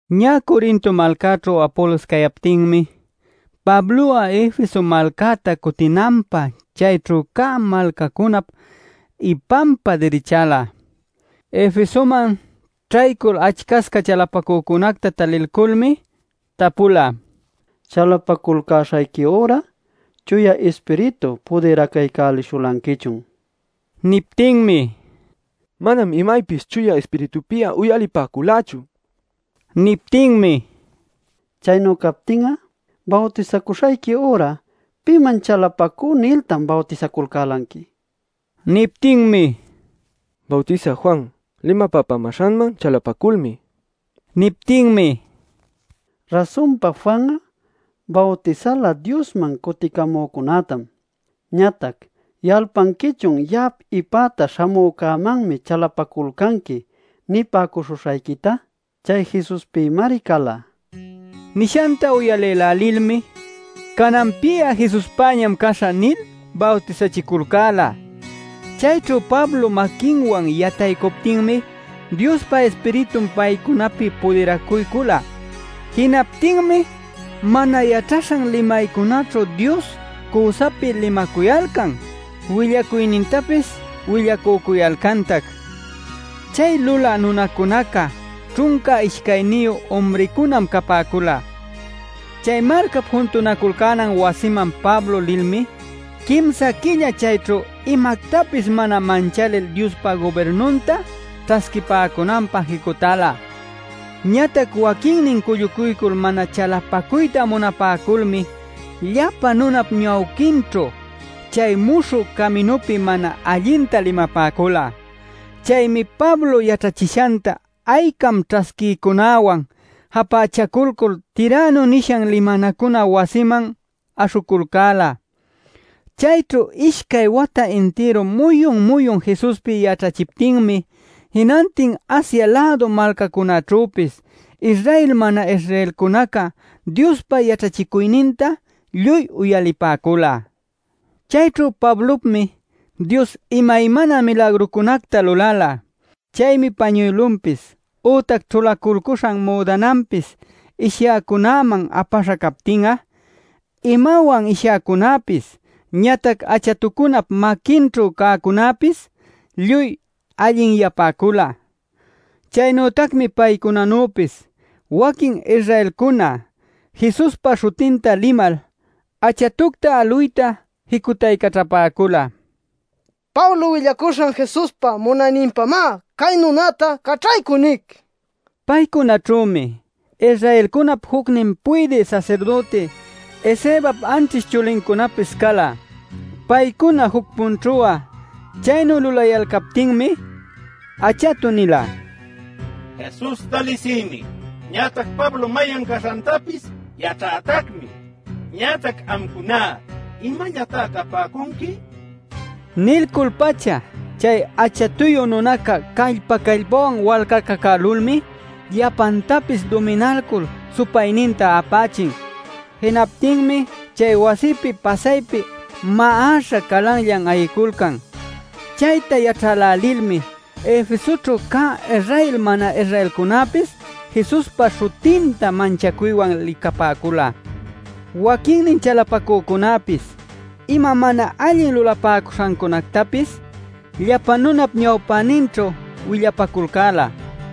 Ñä Corinto malcäćhu Apolos cayaptinmi, Pablo'a Efeso malcäta cutinanpä chayćhu cä malcacunap ipanpa dirichäla. Efesoman ćhaycul achcasca chalapacücunacta talilculmi tapula: “¿Chalapaculcäśhayqui üra, Chuya Ispiritu pudiracuycuśhulanquichun?” nil. Niptinmi: “Manam imaypis Chuya Ispiritupi'a uyalipäculächu” nipäcula. Niptinmi: “Chaynu captin'a bawtisacuśhayqui üra ¿‘piman chalapacú’ niltan bawtisaculcälanqui?” nin. Niptinmi: “Bawtisä Juan limapapämäśhanman chalapaculmi” nipäcula. Niptinmi: “Rasunpa Juan'a bawtisala Diosman cuticamücunätam. Ñatac ¿yalpanquichun ‘Ya'ap ipäta śhamücämanmi chalapaculcanqui’ nipäcuśhuśhayquita? Chay Jesuspïmari cala” nila. Nishanta uyalïlälilmi: “Cananpi'a Jesuspäñam caśhä” nil bawtisachiculcäla. Chayćhu Pablo maquinwan yataycuptinmi Diospa Ispiritun paycunapi pudiracuycula. Jinaptinmi mana yaćhaśhan limaycunaćhu Dios cüsapi limacuyalcan willacuynintapis willacücuyalcantac. Chay lulä nunacunaca ćhunca ishcayniyu umricunam capäcula. Chay malcap juntunaculcänan wasiman Pablo lilmi quimsa quilla chayćhu imactapis mana manchalil Diospa gubirnunta ćhasquipäcunanpä jicutäla. Ñatac waquinnin cullucuycul mana chalapacuyta munapäculmi llapa nunap ñawpäninćhu chay Muśhü Caminupi mana allinta limapäcula. Chaymi Pablo yaćhachishanta aycam ćhasquïcunäwan japächaculcul Tirano nishan limanacuna wasiman aśhuculcäla. Chayćhu ishcay wata intiru muyun-muyun Jesuspi yaćhachiptinmi jinantin Asia-lädu malcacunäćhüpis Israel mana-Israelcunaca Diospa yaćhachicuyninta lluy uyalipäcula. Chayćhu Pablopmi Dios imaymana milagrucunacta lulala. Chaymi pañuylunpis, ütac ćhulaculcuśhan müdananpis ishyäcunäman apaśha captin'a imawan ishyäcunapis, ñatac achatucunap maquinćhu cäcunapis lluy allinyapäcula. Chaynütacmi paycunanüpis waquin Israelcuna Jesuspa śhutinta limal achatucta aluyta jicutaycaćhapäcula “Pablo willacuśhan Jesuspa munayninpamá, cay nunäta caćhaycuy nic” nil. Paycunaćhümi Israelcunap jucnin puydï sasirdüti Escevap anćhish chulincunapis cala. Paycuna juc-punćhu'a chaynu lulayalcaptinmi achatu nila: “Jesusta lisïmi, ñatac Pablo mayan caśhantapis yaćhätacmi. Ñatac amcuná ¿imallatá capäcunqui?” nin. Nilcul-pacha chay achatuyu nunaca callpa-callpawan walcacacälulmi llapantapis duminalcul supayninta apächin. Jinaptinmi chay wasipi pasaypi ma'aśha calanllan ayiculcan. Chayta yaćhälälilmi Efesoćhu cä Israel mana-Israelcunäpis Jesuspa śhutinta manchacuywan licapäcula. Waquinnin chalapacücunäpis ima mana allin lulapäcuśhantapis llapa nunap ñawpäninćhu willapaculcäla.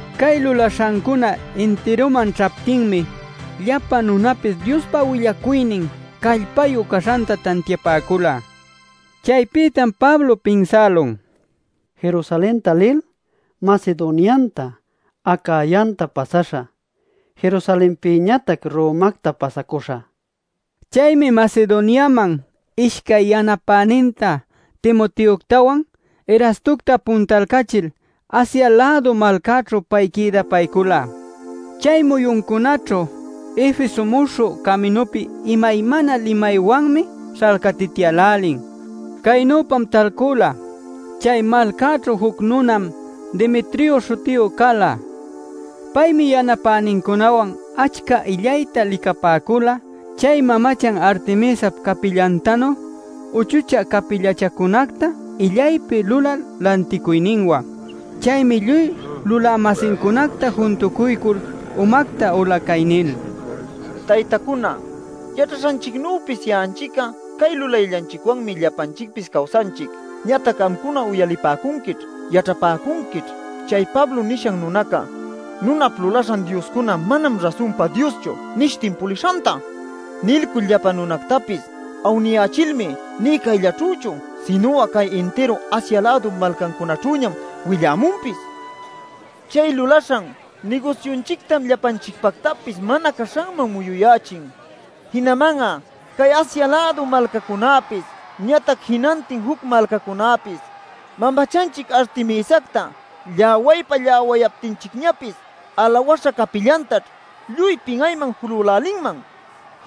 Cay lulaśhancuna intiruman ćhaptinmi llapa nunapis Diospa willacuynin callpayu caśhanta tantiapäcula. Chaypïtam Pablo pinsälun: “Jerusalenta lil, Macedonianta, Acayanta pasäśhä. Jerusalenpïñatac Romacta pasacuśhä” nil. Chaymi Macedoniaman ishcay yanapäninta Timoteoctawan, Erastocta puntalcachil Asia-lädu malcäćhu pay quïdapaycula. Chay muyuncunäćhu Efesoćhu Muśhü Caminupi imaymana limaywanmi śhalcatityälälin. Caynüpam talcula: chay malcäćhu juc nunam Demetrio śhutiyu cala. Paymi yanapänincunawan achca illayta licapäcula chay mamachan Artemisap capillantanu uchuchä capillachancunacta illaypi lulal lanticuyninwan. Chaymi lluy lulä-masincunacta juntucuycul umacta ula cay nil: “Taytacuna, yaćhaśhanchicnüpis ya'anchic'a cay lulayllanchicwanmi llapanchicpis cawsanchic. Ñatac amcuna uyalipäcunquićh, yaćhapäcunquićh chay Pablo nishan nunaca: ‘Nunap lulaśhan dioscuná manam rasunpa dioschu’ nishtin pulishanta. Nilcul llapa nunactapis awniyächilmi nï cayllaćhüchu sinu'a cay intiru Asia-lädup malcancunaćhüñam willämunpis. Chay lulaśhan nigusyunchictam llapanchicpactapis mana caśhanman muyuyächin. Jinaman'a cay Asia-lädu malcacunäpis ñatac jinantin juc malcacunäpis mamachanchic Artemisacta lläwaypa-lläwayaptinchicñapis alawäśha capillantaćh lluy pin'ayman julälälinman.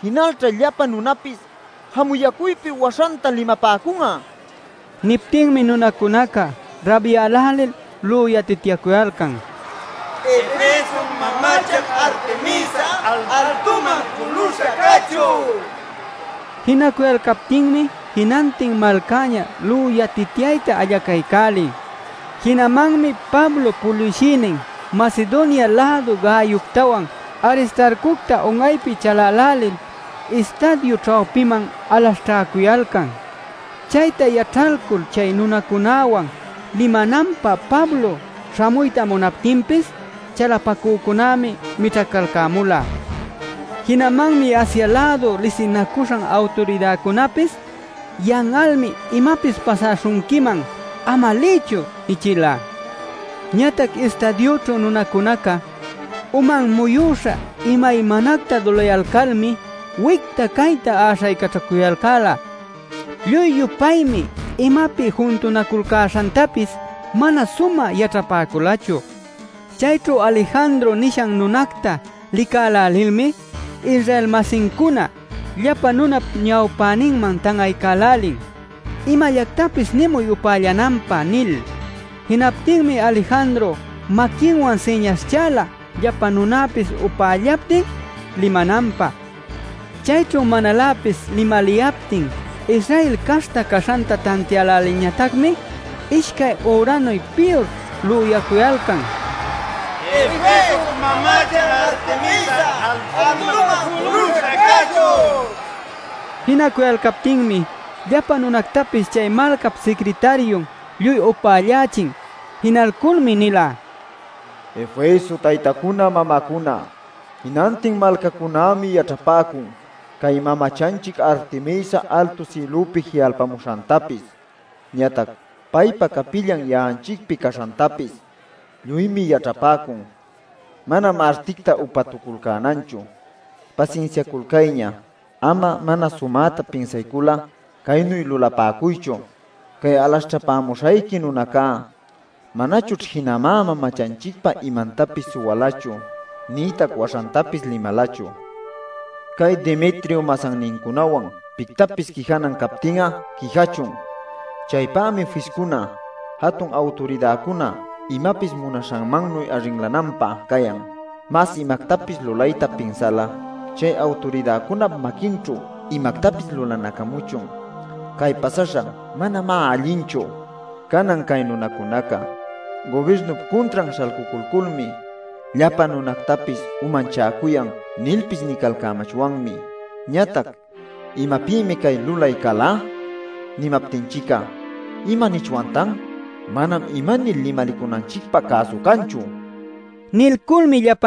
Jinalćha llapa nunapis jamuyacuypi waśhanta limapäcun'a” nila. Niptinmi nunacunaca rabyälälil lüyatityacuyalcan: “¡Efesop mamachan Artemisa, altuman juluśha cachun!” nil. Jinacuyalcaptinmi jinantin malcäña lüyatityayta allacaycälin. Jinamanmi Pablop puliwshïnin Macedonia-lädu Gayoctawan, Aristarcocta un'aypi chalälälil istadiu ćhawpiman alaśhćhäcuyalcan. Chayta yaćhalcul chay nunacunäwan limananpä Pablo śhamuyta munaptinpis chalapacücunämi mićhacalcämula. Jinamanmi Asia-lädu lisinacuśhan awturidäcunapis “Yan'almi imapis pasaśhunquiman. ¡Ama liychu!” nichila. Ñatac istadiućhu nunacunacá uman muyüśha imaymanacta lüyayalcalmi wicta cayta äśhaycaćhacuyalcäla. Lluy-yupaymi imapi juntunaculcäśhantapis mana sumä yaćhapäculachu. Chayćhu Alejandro nishan nunacta licälälilmi Israel-masincuna llapa nunap ñawpäninman tan'aycälälin: “¡Imallactapis nimuy upällapäcunanpä!” nil. Jinaptinmi Alejandro maquinwan siñaśhchala llapa nunapis upällaptin, limananpä. Chayćhu manaläpis limaliyaptin Israel caśhta caśhanta tantiälälilñatacmi ishcay üranuy piyur lüyacuyalcan: “¡Efesop mamachan Artemisa altuman juluśha cachun!” nil. Jinacuyalcaptinmi llapa nunactapis chay malcap sicritariun lluy upällächin. Jinalculmi nila: “Efeso taytacuna mamacuna, jinantin malcacunämi yaćhapäcun cay mamachanchic Artemisa altu sïlüpi ji'alpamuśhantapis, ñatac paypa capillan ya'anchicpi caśhantapis. Lluymi yaćhapäcun; manam articta upatuculcänanchu. Pasinsiaculcayña; ama mana sumäta pinsaycul'a caynu lulapäcuychu. Cay alaśhćhapämuśhayqui nunacunaca manachućh jinamá mamachanchicpa imantapis suwalachu, nïtac waśhantapis limalachu. Cay Demetrio masannincunawan pictapis quijanan captin'a, quijachun. Chaypämi fiscuna, jatun awturidäcuna imapis munaśhanmannuy arrinlananpä cayan. Mas imactapis lulayta pinsal'a, chay awturidäcunap maquinćhu imactapis lulanacamuchun. Cay pasaśhan manamá allinchu. Canan ‘Cay nunacunaca gubirnup cuntran śhalcuculculmi llapa nunactapis umachäcuyan’ nilpis nicalcamachwanmi. Ñatac ‘¿Imapïmi cay lüyay cala?’ nimaptinchic'a ¿imanichwantan? Manam imanil limalicunanchicpä cäsu canchu” nila.